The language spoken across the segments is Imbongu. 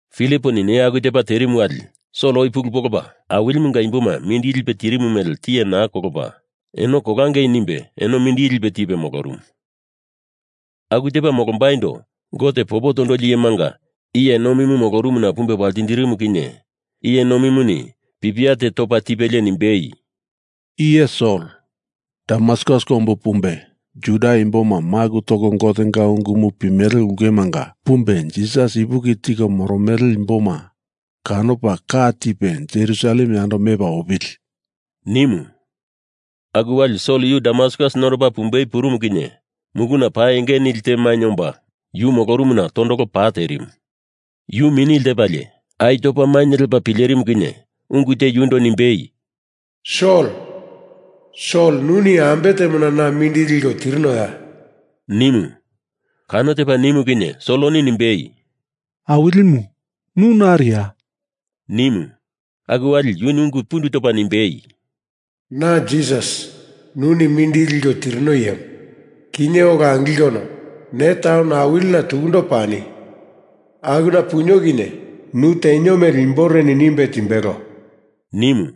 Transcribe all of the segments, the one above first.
Filiponi neya aku tepa terimu wali Sol oi pulu polopa Awilimunga imboma mindili lipe tirimu mele tiye naa kolopa, eno kolangei nimbe eno mindili lipe tipe molorumu. Aku tepa molombaindo Gote popo tondoli iyemanga iye nomimu molorumuna pumbe waltindirimu kinye iye nomimuni pipia te topa tipelie nimbei, “I iye Sol, Damaskus kombu pumbe Juda imboma maku toko Gotenga ungumu pimele ulkemanga pumbe, Jisas ipuki tiko moromele imboma kanopa ka tipe Jerusalem yando mepa opili,” nimu. Aku wali Sol yu Damaskus nondopa pumbei purumu kinye muluna pa enge nili te mainye omba yu molorumuna tondolo pa terimu. Yu mini lepalie ai topa mainye lepa pilerimu kinye ungu te yundo nimbei, “Sol, Sol nuni ambe temona na mindili liko tirinoya?” nimu. Kano tepa nimu kinye Soloni nimbei, “Awilimu, nu nariya?” nimu. Aku wali yuni ungu pundu topa nimbei, “Na Jisas, nuni mindili liko tirino iyemu. Kinye ola angilkono ne taun awilina tukundo pani. Akuna punio kinye nu tenio mele imboreni nimbe timbelo,” nimu.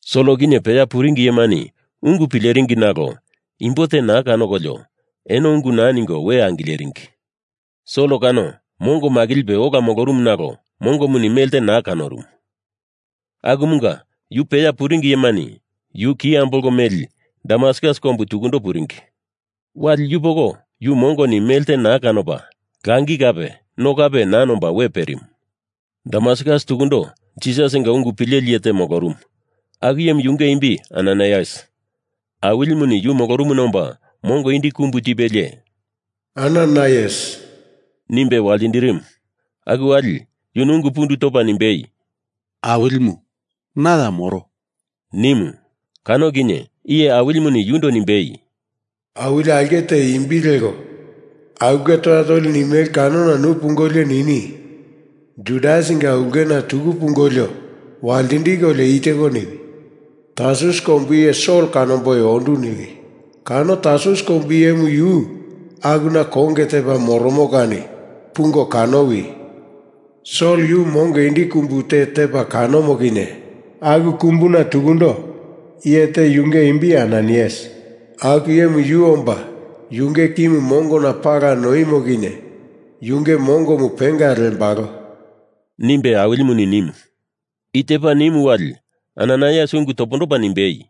Sol kinye peya puringi iyemani ungu pileringi nalo, imbo te naa kanokolio, eno ungu naa ningo we angileringi. Sol kano mongo makilipe ola molorumu nalo mongoni melte naa kanorumu. Akumunga yu peya puringi iyemani yu ki ambolko meli Damaskus kombu tukundo puringi. Wali yupoko yu mongoni melte naa kanopa langi kape no kape naa nomba we perimu. Damaskus tukundo Jisasinga ungu pileli iye te molorumu, aku iyemu yunge imbi Ananaias. Awilimuni yu molorumuna omba mongo indi kumbu tipelie “Ananaias” nimbe waltindirimu. Aku wali yuni ungu pundu topa nimbei, “Awilimu, na ya moro,” nimu. Kano kinye Iye Awilimuni yundo nimbei, “Awili aulke te imbi leko Aulke Toya Tolimu nimele kanona nu pungolio nini Judasinga ulkena tuku pungolio waltindikolio i teko niwi. Tarsus kombu iye Sol kanomboi ondu niwi. Kano Tarsus kombu iyemu yu akuna konge tepa moromo kani pungo kanowi! Sol yu mongo indi kumbu te tepa kanomo kinye aku kumbuna tukundo iye te yunge imbi Ananaias aku iyemu yu omba yunge kimu mongona pala noimo kinye yunge mongomu penga lembalo,” nimbe Awilimuni nimu. I tepa nimu wali Ananaias ungu topondopa nimbei,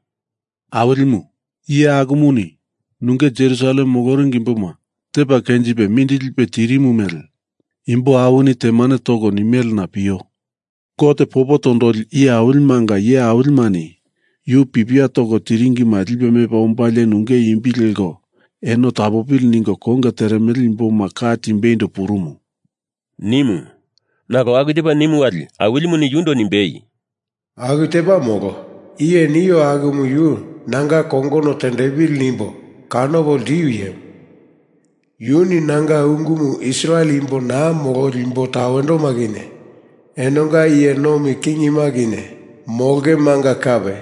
“Awilimu, iye akumuni nunge Jerusalem moloringi imboma tepa kenjipe mindili lipe tirimu mele imbo awini temane toko nimelena pio. Gote popo tondoli iyemanga iye awilimani yu pipia toko tiringima lipe mepa ombalie nunge imbi leko eno tapopili ningo konge teremele imboma ka timbeindo purumu,” nimu. Nalo aku tepa nimu wali Awilimuni yundo nimbei, “Aku tepa molo. Iye nio akumu yu nanga kongono tendepili nimbo kanopo ltiu iyemu. Yuni nanga ungumu Israel imbo naa mololi imbo tawendoma kinye enonga iye nomi kingima kinye molongemanga kape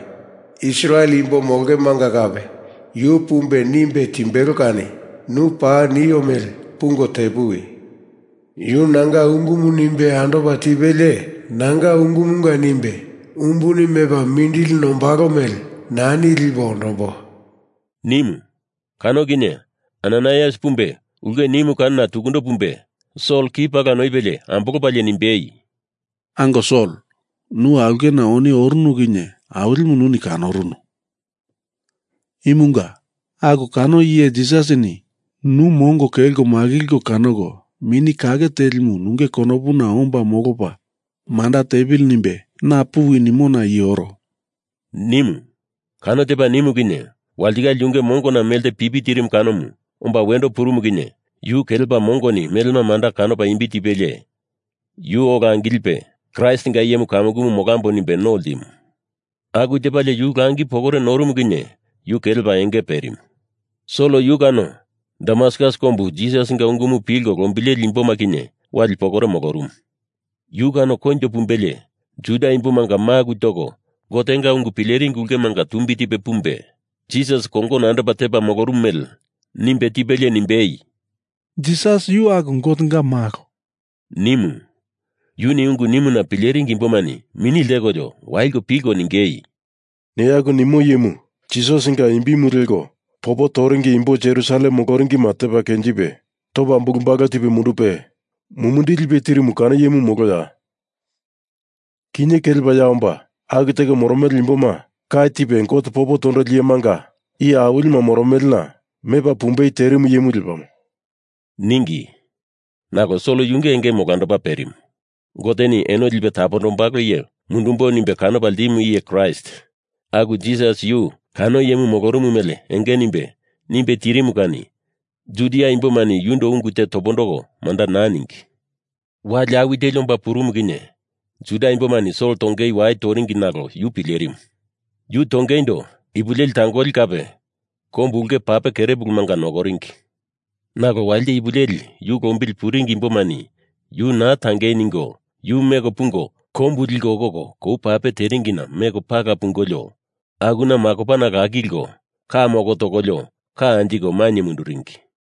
Israel imbo molongemanga kape yu pumbe nimbe timbelo kani nu paa nio mele pungo tepuwi. Yu nanga ungumu nimbe andopa tipelie nanga ungumunga nimbe umbuni mepa mindili nombalo mele nani lipo ondombo,” nimu. Kano kinye Ananaias pumbe ulke nimu kanona tukundo pumbe Sol ki pala noipelie ambolopalie nimbei, “Ango Sol, nu aulkena oni orunu kinye Awilimu nuni kanorunu. Imunga aku kano iye Jisasini nu mongo kelko makilko kanoko Mini Kake Telimu nunge konopuna omba molopa manda tepili nimbe na puwi nimona i oro,” nimu. Kano tepa nimu kinye walitikale yunge mongona melte pipi tirimu kanomu omba wendo purumu kinye yu kelepa mongoni melema manda kanopa imbi tipelie, yu ola angilipe Kraistinga iyemu kamukumu molambo nimbe no ltimu. Aku tepalie yu langi pokore norumu kinye yu kelepa enge perimu. Sol yu kano Damaskus kombu Jisasinga ungumu pilko lombileli imboma kinye wali pokore molorumu. Yu kano koinjo pumbelie Judia imbomanga maku toko Gotenga ungu pileringi ulkemanga tumbi tipe pumbe Jisas kongono andopa tepa molorumu mele nimbe tipelie nimbei, “Jisas yu aku Gotenga malo,” nimu. Yuni ungu nimuna pileringi imbomani mini ltekolio waliko pilko ningei, “Ne aku nimo iyemu Jisasinga imbimu leko popo toringi imbo Jerusalem moloringima tepa kenjipe topa bulu balu tipe mundupe mumindili lipe tirimu kano iyemu moloya? Kinye kelepa ya omba aku teko moromele imboma ka tipe Gote popo tondoli iyemanga iye awilima moromelena mepa pumbei terimu iyemu lepamo,” ningi. Nalo Sol yunge engemu olandopa purumu. Goteni eno lipe tapondombalo iye mundumbo nimbe kanopa ltimu iye Kraist aku Jisas yu kano iyemu molorumu mele enge nimbe, nimbe tirimu kani Judia imbomani yundo ungu te topondoko manda naa ningi. Wali awi teli omba purumu kinye Juda imbomani Sol tongeindo wai toringi, nalo yu pilerimu. Yu tongeindo ipu leli tangoli kape kombu ulke pape kerepulumanga nokoringi. Nalo walite ipu leli yu lombili puringi imbomani yu naa tangei ningo yu meko pungo kombu liko okoko kou pape teringina meko pala pungolio akuna makopana lakilko ka moko tokolio ka anjiko mainye munduringi.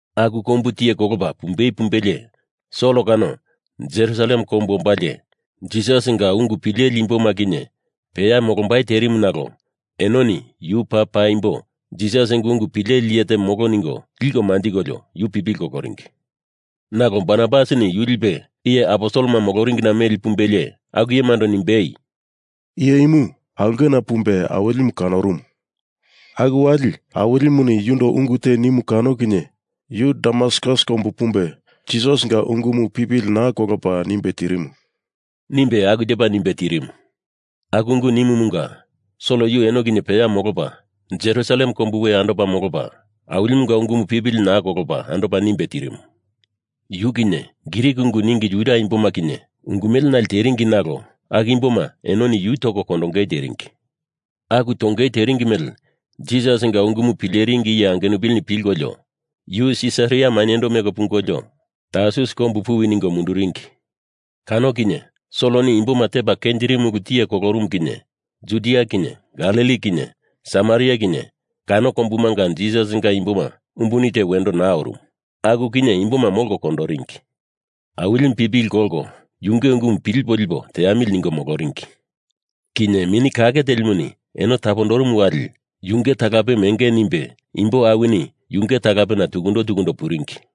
Aku kombu tiye kolopa pumbe pumbelie Sol kano Jerusalem kombu ombalie, Jisasinga ungu pileli imboma kinye peya molombai terimu nalo enoni yu paa paimbo Jisasinga ungu pileli iye te molo ningo liko manjikolio yu pipili koloringi. Nalo Barnabasini yu lipe iye aposelema moloringina meli pumbelie aku iyemando nimbei, “Iye imu aulkena pumbe Awilimu kanorumu. Aku wali Awilimuni yundo ungu te nimu kano kinye yu Damaskus kombu pumbe Jisasinga ungumu pipili naa kolopa nimbe tirimu,” nimbe aku tepa nimbe tirimu. Aku ungu nimumunga Sol yu eno kinye peya molopa, Jerusalem kombu we andopa molopa, Awilimunga ungumu pipili naa kolopa andopa nimbe tirimu. Yu kinye Grik ungu ningi Juda imboma kinye ungu mele nale teringi nalo aku imboma enoni yu toko kondongei teringi. Aku tongei teringi mele Jisasinga ungumu pileringi iye angenupilini pilkolio, yu Sisaria mainyendo meko pungolio Tarsus kombu puwi ningo munduringi. Kano kinye Soloni imboma tepa kenjirimu ulumu tiye kolorumu kinye Judia kinye Galili kinye Samaria kinye kano kombumanga Jisasinga imboma umbuni te wendo naa orumu. Aku kinye imboma molko kondoringi. Awilimu pipili kolko yunge ungumu pilipo lipo teamili ningo moloringi. Kinye Mini Kake Telimuni eno tapondorumu wali yunge talapemu enge nimbe imbo awini yunge talapena tukundo tukundo puringi.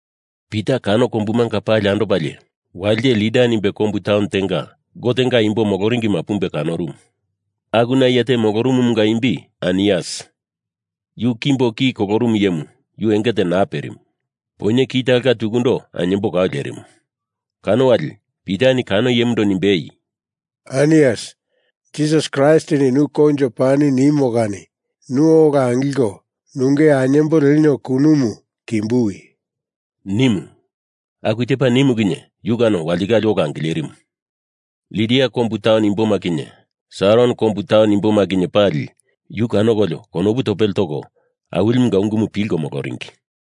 Pita kano kombumanga pali andopalie walite Lida nimbe kombu taun tenga Gotenga imbo moloringima pumbe kanorumu. Akuna iye te molorumumunga imbi Ainias, yu kimbo ki kololi iyemu yunge enge te naa perimu. Poinye ki talonga tukundo ainyembo kau lerimu. Kano wali Pitani kano iyemundo nimbei, “Ainias, Jisas Kraistini nu koinjo pani nimo kani nu ola angilko nunge ainyembo lenio kunumu kimbuwi,” nimu. Aku tepa nimu kinye yu kano walitikale ola angilerimu. Lida kombu taun imboma kinye Saron kombu taun imboma kinye pali yu kanokolio konopu topele toko Awilimunga ungumu pilko moloringi.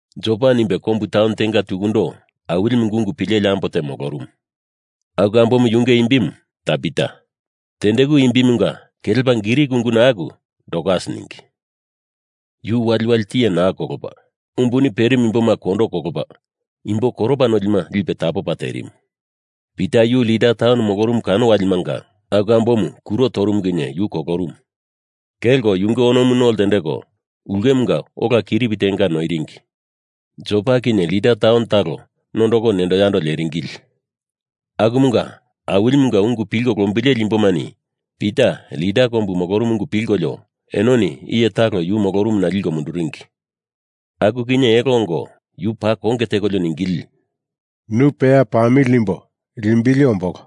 Jopa nimbe kombu taun tenga tukundo Awilimunga ungu pileli ambo te molorumu. Aku ambomu yunge imbimu Tabita, tendeku imbimunga kelepa Grik unguna aku Dorkas ningi. Yu waliwali tiye naa kolopa, umbuni perimu imboma kondo kolopa imbo koropa nolima lipe tapopa terimu. Pita yu Lida taun molorumu kano walimanga aku ambomu kuro torumu kinye yu kolorumu. Kelko yunge onomu no ltendeko ulkemunga olana kiripi tenga noiringi. Jopa kinye Lida taun talo nondoko nendo yando leringili. Akumunga Awilimunga ungu pilko lombileli imbomani Pita Lida kombu molorumu ungu pilkolio enoni iye talo yu molorumuna liko munduringi. Aku kinye elo ongo yu paa konge tekolio ningili, “Nu peya pamili nimbo limbili ombolo,”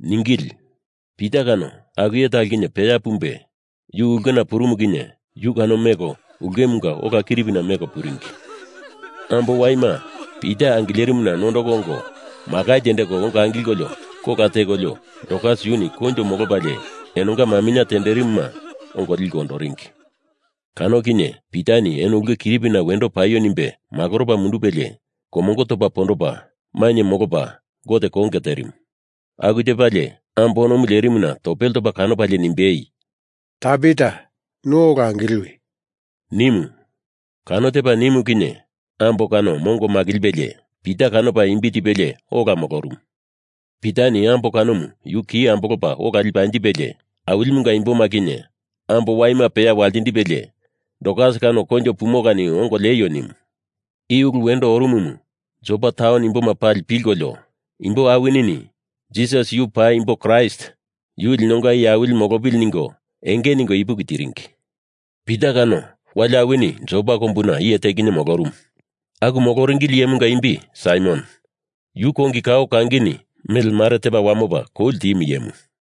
ningili. Pita kano aku iye talo kinye peya pumbe yu ulkena purumu kinye yu kano meko ulkemunga ola kiripina meko puringi. Ambo waima Pita angilerimuna nondoko ongo makai tendeko ongo angilko kola tekolio Dorkas yuni koinjo molopalie enonga maminye tenderimuma ongo liko ondoringi. Kano kinye Pitani eno ulke kiripina wendo paio nimbe makoropa mundupelie komongo topa pondopa mainye molopa Gote konge terimu. Aku tepalie ambo onomu lerimuna topele topa kanopalie nimbei, “Tabita nu ola angiliwi,” nimu. Kano tepa nimu kinye ambo kano mongo makilipelie Pita kanopa imbi tipelie ola molorumu. Pitani ambo kanomu yu ki ambolopa ola lipe anjipelie, Awilimunga imboma kinye ambo waima peya waltindipelie Dorkas kano koinjo pumo kani ongo lieio nimu. I ulu wendo orumumu Jopa taun imboma pali pilkolio, imbo awinini Jisas yu paimbo Kraist, yu linonga Iye Awili molopili ningo enge ningo ipuki tiringi. Pita kano, wali awini Jopa kombuna iye te kinye molorumu. Aku moloringili iyemunga imbi Saimon, yu kongi kao kangini mele mare tepa wamopa kou ltimu iyemu.